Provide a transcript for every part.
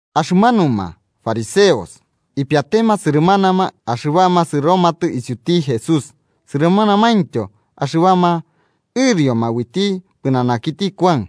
Axɨmanuma fariseos ipiatema sɨrɨmanama axɨbama sɨromatɨ isiuti Jesús sɨrɨmanamaintyo axɨbama ɨrioma uiti pɨnanakiti Kuan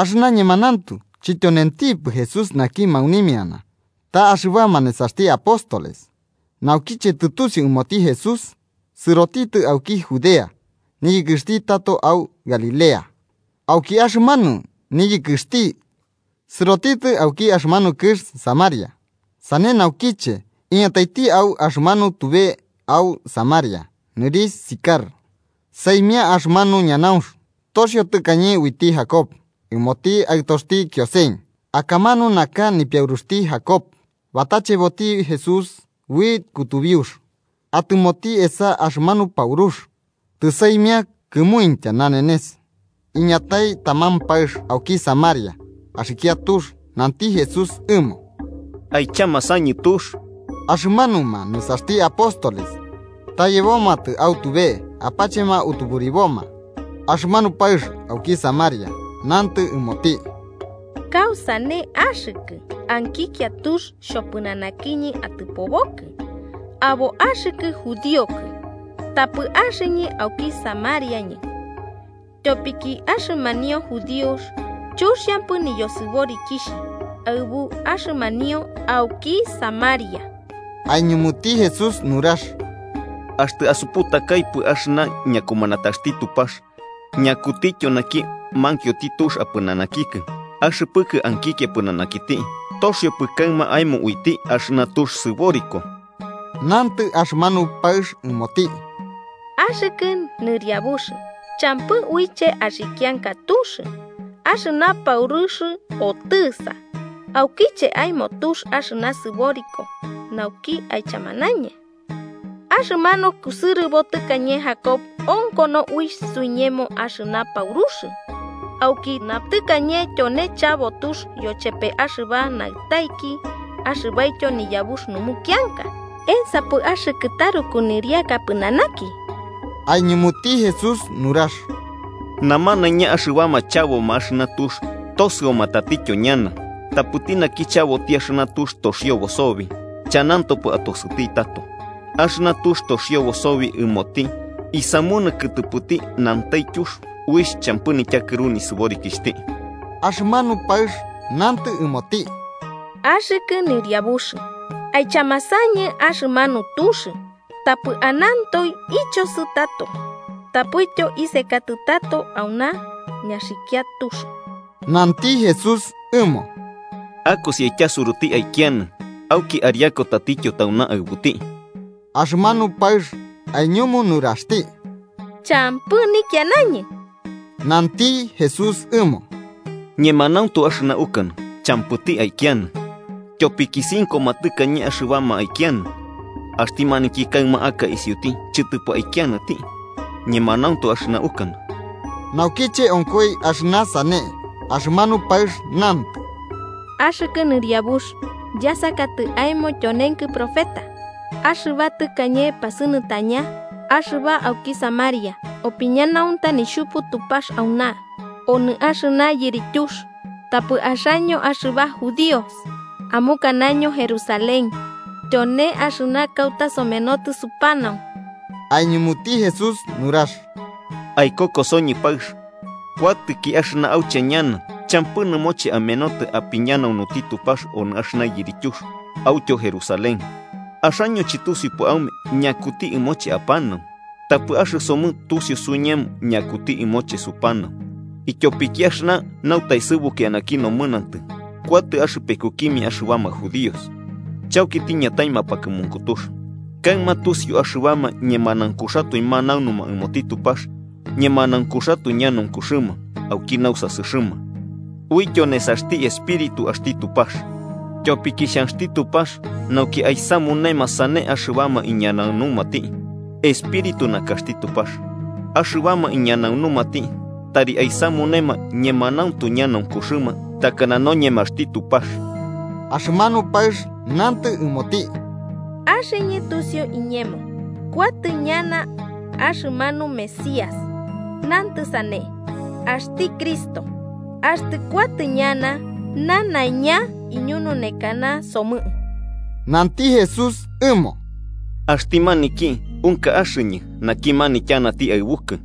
(axɨna ñemanauntu chityonentipɨ Jesús naki maunimiana, ta axɨbama nesaxti apóstoles). Naukiche tɨtusiu ɨmoti Jesús, sɨrotitɨ auki Judea niyɨkɨxti tato au Galilea. Auki axɨmanu niyɨkɨxti, sɨrotitɨ auki axɨmanu kɨx Samaria. Sane naukiche iñataiti au axɨmanu tube au Samaria nɨrixh Sicar, saimia axɨmanu ñanaunx toxio tɨkañe uiti Jacob ɨmoti aɨtoxti Kiosen. Akamanu nakax nipiauruxti Jacob. Batacheboti Jesús ui kutubiux, atɨmoti esa axɨmanu paurux. Tɨsaimia kɨmuintya nanenes. Iñatai taman paɨx auki Samaria axikia tux. Nanti Jesús ɨmo: –Aichamasañɨ tux. Axɨmanuma nesaxti apóstoles ta yebomatɨ au tube apachema utuburiboma. Axɨmanu paɨx auki Samaria nantɨ ɨmoti: –¿Kausane axɨkɨ, ankikia tux xhopɨnanakiñɨ atɨpobokɨ, abo axɨkɨ judíokɨ, tapɨ axɨñɨ auki Samariañɨ? –¿Tyopiki axɨmanuma judíos chuxiampɨ nisɨborikixhimia aɨbuma axɨmanuma auki Samaria? Aiñumuti Jesús nurax: –Axtɨ asuputakaipɨ axɨna ñakumanataxti Tupax, ñakutityo naki mankioti tux apɨnanakikɨ, axɨpɨkɨ ankikia pɨnanakiti, toxiopɨ kaɨma aemo uiti axɨna tux sɨboriko. Nantɨ axɨmanu paɨx ɨmoti: –Axɨkɨ Nɨriabux, champɨ uiche axikianka tux, axɨna paurux otɨsa: ¿aukiche aemo tux axɨna sɨboriko nauki aichamanañɨ? Axɨmanu kusɨrɨbo tɨkañe Jacob onkono uixh suiñemo axɨna paurux, aukina tɨkañe tyone chabo tux yochepe axɨba naɨtaiki axɨbaityo niyabux numukianka. ¿Ensapɨ axɨkɨ taruku nɨriaka pɨnanaki? Aiñumuti Jesús nurax: –Namanaiña axɨbama chabo axɨna tux, tosɨoma tatityo ñana. Tapɨti naki chaboti axɨna tux toxiobo sobi, chanantopɨ atosɨti tato. Axɨna tux toxiobo sobi ɨmoti isamunɨ kɨtɨpɨti nantaityux uixh champɨ nityakɨru nisɨborikixhti. Axɨmanu paɨx nantɨ ɨmoti: –Axɨkɨ Nɨriabux, aichamasañɨ axɨmanu tux, tapɨ ananto ichosɨ tato tapɨtyo isekatɨ tato auna ñaxɨkia tux. Nanti Jesús ɨmo: –Akosi aityasuruti aikianɨ auki ariaku tatityo tauna aɨbuti. Axɨmanu paɨx aiñumu nuraxti: –Champɨ nikianañɨ. Nanti Jesús ɨmo: –Ñemanauntu axɨna ukanɨ champɨti aikianɨ. Tyopiki cinkoma tɨkañe axɨbama aikianɨ, axti maniki kaɨma aka isiuti chɨtɨpɨ aikianɨti. Ñemanauntu axɨna ukanɨ. Naukiche onkoi axɨna sane, axɨmanu paɨx nantɨ: –Axɨkɨ Nɨriabux, yasakatɨ aemo tyonenkɨ profeta. Axɨba tɨkañe pasɨnɨtaña, axɨba auki Samaria, opiñanaunta Nixhupu Tupax auna, onɨ axɨna yirityux. Tapɨ axaño axɨba judíos amukanaño Jerusalén tyone axɨna kauta somenotɨ supanau. Aiñumuti Jesús nurax: –Aikokosoñɨ paɨx, kuatɨki axɨna auche ñana champɨ nɨmoche amenotɨ apiñanaunuti Tupax onɨ axɨna yirityux autyo Jerusalén. Axaño chɨtusiupɨ aume ñakuti ɨmoche apanau. Tapɨ axɨsomɨ tusiu suiñemo ñakuti ɨmoche supanau, ityopiki axɨna nautaesɨbuku eanaki nomɨnantɨ kuatɨ axɨpekukimia axɨbama judíos. Chauki tiñatai mapakɨmunkutux, kaɨma tusiu axɨbama ñemanaunkuxatoe manaunuma ɨmoti Tupax ñemanaunkuxatoe ñanaunkuxɨma, auki nausasɨxɨma uityo nesaxti Espíritu axti Tupax. Tyopiki xhanxti Tupax nauki aisamunema sane axɨbama iñanaunumati. Espíritu nakaxti Tupax, axɨbama iñanaunumati tari aisamunema ñemanauntu ñanaunkuxɨma, takana noñemaxti Tupax. Axɨmanu paɨx nantɨ ɨmoti: –Axɨñɨ tusiu iñemo kuatɨ ñana axɨmanu Mesías (nantɨ sane, axti Cristo). Axtɨ kuatɨ ñana, nanaiña iñununekanasomɨ. Nanti Jesús ɨmo: –Axti maniki, unka axɨñɨ, naki manityanati aɨbukɨ.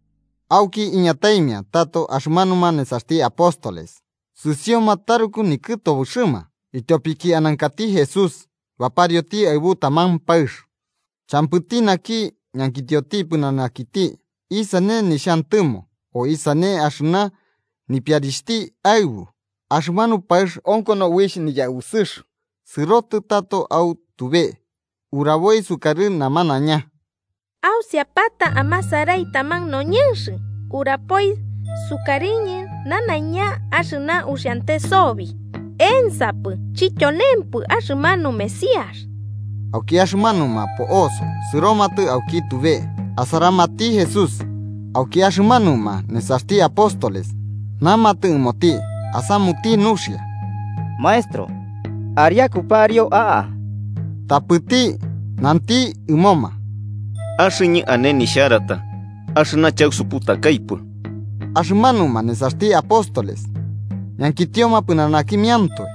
Auki iñataimia tato axɨmanuma nesaxti apóstoles, sɨsioma taruku nikɨtobɨxɨma ityopiki anankati Jesús baparioti aɨbu taman paɨx. Champɨti naki ñankitio pɨnanakiti isane nixhantɨmo o isane axɨna nipiarixhti aɨbu. Axɨmanu paɨx onkono uixh niyausɨx sɨrotɨ tato au tube, uraboi sukarɨ namanaiña: 29–Ausiapata amasarai taman noñɨnx urapoi sukarɨñɨ nanaiña axɨna uxiante sobi. ¿Ensapɨ chityonempɨ axɨmanu Mesías? Auki axɨmanuma po'oso sɨromatɨ auki tube asaramati Jesús. Auki axɨmanuma nesaxti apóstoles namatɨ ɨmoti asamuti nuxia: –Maestro, ariako pariu a'a. Tapɨti nanti ɨmoma: –Axɨñɨ ane nixharata, axɨna chausuputakaipɨ. Axɨmanuma nesaxti apóstoles ñankitioma pɨnanakimiantoe: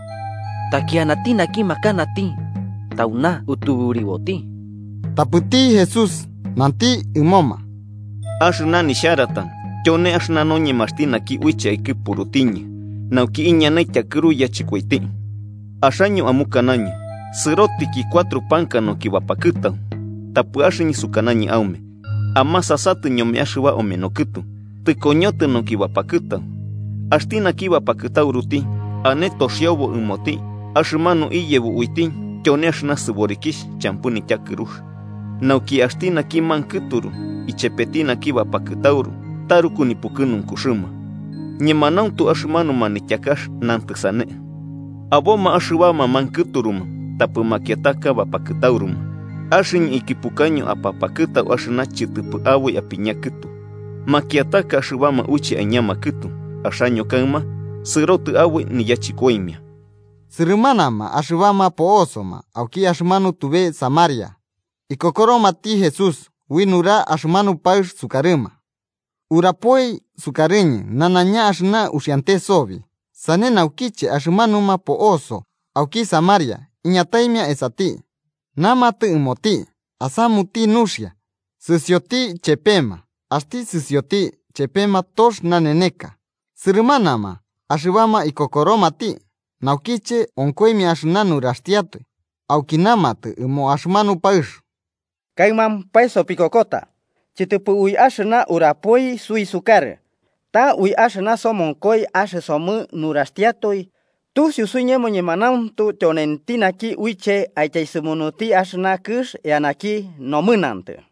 –¿Taki anati naki makanati tauna utuburiboti? Tapɨti Jesús nanti ɨmoma: –Axɨna nixharata tyone axɨna noñemaxti naki uiche aikɨpurutiñɨ nauki iñanai tyakɨru yachɨkoiti. Axaño amukanaño: ‘Sɨrotiki cuatro panka nauki bapakɨtau.’ Tapɨ axɨñɨ sukanañɨ aume amasasatɨ ñome axɨba ameno kɨtu, tɨkoñotɨ nauki bapakɨtau. Axti naki bapakɨtauruti ane toxiobo ɨmoti axɨmanu iyebo uiti tyone axɨna sɨborikixh champɨ nityakɨrux, nauki axti naki mankɨturu ichepeti naki bapakɨtauru taruku nipukɨnunkuxɨma. Ñemanauntu axɨmanu manityakax nantɨ sane, ‘Aboma axɨbama mankɨturuma tapɨ makiataka bapakɨtauruma.’ Axɨñɨ ikɨpukaño apapakɨtau axɨna chɨtɨpɨ aboi apiña kɨtu. Makiataka axɨbama uiche aiñama kɨtu, axaño kaɨma sɨrotɨ aboi niyachɨkoimia. Sɨrɨmanama axɨbama po'osoma auki axɨmanu tube Samaria ikokoromati Jesús ui nurax axɨmanu paɨx sukarɨma: “Urapoi sukarɨñɨ nanaiña axɨna uxiante sobi.” Sane naukiche axɨmanuma po'oso auki Samaria iñataimia esati, namamatɨ ɨmoti asamuti nuxia sɨsioti ichepema. Axti sɨsioti ichepema tox naneneka, sɨrɨmanama axɨbama ikokoromati naukiche onkoimia axɨna nuraxtiatoe. Auki namatɨ ɨmo axɨmanu paɨx: –Kaɨmampae sopikokota, chɨtɨpɨ ui axɨna urapoi suisukarɨ, ta ui axɨna somonkoi axɨsomɨ nuraxtiatoe tusiu suiñemo ñemanauntu tyonenti naki uiche aityaesɨmunuti axɨna kɨx eanaki nomɨnantɨ.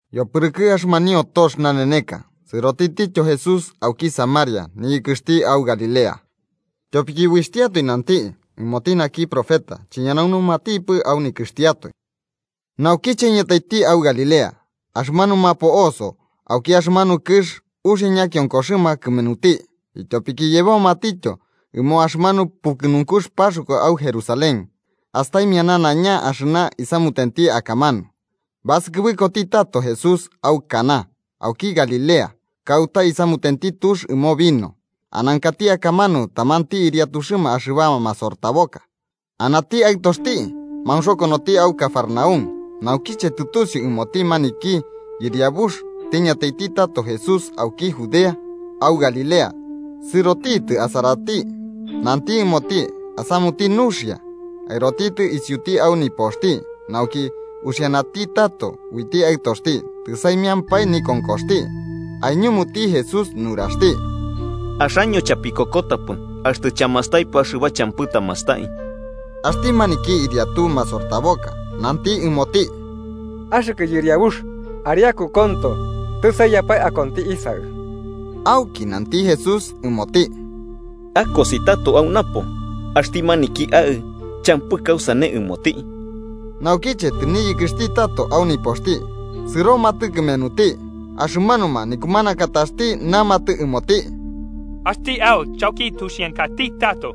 Yopɨrɨkɨ axɨmanio tox naneneka, sɨrotitityo Jesús auki Samaria niyɨkɨxti au Galilea. Tyopiki, uixhtiatoe nanti, ɨmoti naki profeta chiñanaunumatipɨ au nikɨxtiatoe. Naukiche iñataiti au Galilea, axɨmanuma po'oso auki axɨmanu kɨx uxia ñakionkoxɨma kɨmenuti, ityopiki yebomatityo ɨmo axɨmanu pukɨnunkux Paxkua au Jerusalén astaimia nanaiña axɨna isamutenti akamanu. Basɨkɨbɨkoti tato Jesús au Caná auki Galilea, kauta isamutenti tux ɨmo vino. Anankati akamanu tamanti ɨriatuxɨma axɨbama masortaboka, anati aɨtoxti maunxokonoti au Cafarnaúm. Naukiche tɨtusiu ɨmoti maniki yɨriabux tiñataiti tato Jesús auki Judea au Galilea, sɨrotitɨ asarati nanti ɨmoti asamuti nuxia aɨrotitɨ isiuti au nipoxti nauki uxianati tato uiti aɨtoxti, tɨsaimiampae nikonkoxti. Aiñumuti Jesús nuraxti: –Axaño chapikokotapɨ, axtɨ chamastaipɨ axɨba champɨ tamastai. Axti maniki ɨriatu masortaboka nanti ɨmoti: –Axɨkɨ Yɨriabux, ariaku konto, tɨsaiyapae akonti isaɨ. Auki nanti Jesús ɨmoti: –Akosi tato au napo. Axti maniki aɨ champɨ kausane ɨmoti. Naukiche tɨniyɨkɨxti tato au nipoxti, sɨromatɨ kɨmenuti axɨmanuma nikumanakataxti namatɨ ɨmoti: –Axti aɨ chauki tuxiankati tato.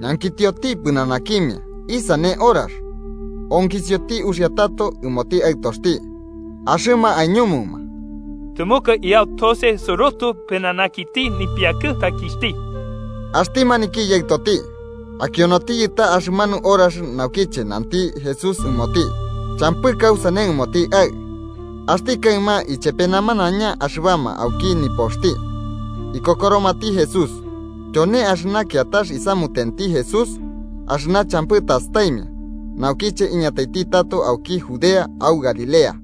Ñankitioti pɨnanakimia isane horax onkisioti uxia tato ɨmoti aɨtoxti, axɨma aiñumuma: –Tɨmɨka iyau tose sɨrotɨ pɨnanakiti nipiakɨtaikixhti. Axti maniki yaɨtoti akionotiyɨ ta axɨmanu horax naukiche nanti Jesús ɨmoti: “Champɨ kausane ɨmoti aɨ”. Axti kaɨma ichepe namanaiña axɨbama auki nipoxti ikokoromati Jesús. Tyone axɨna kiatax isamutenti Jesús axɨna champɨ tastaimia, naukiche iñataiti tato auki Judea au Galilea.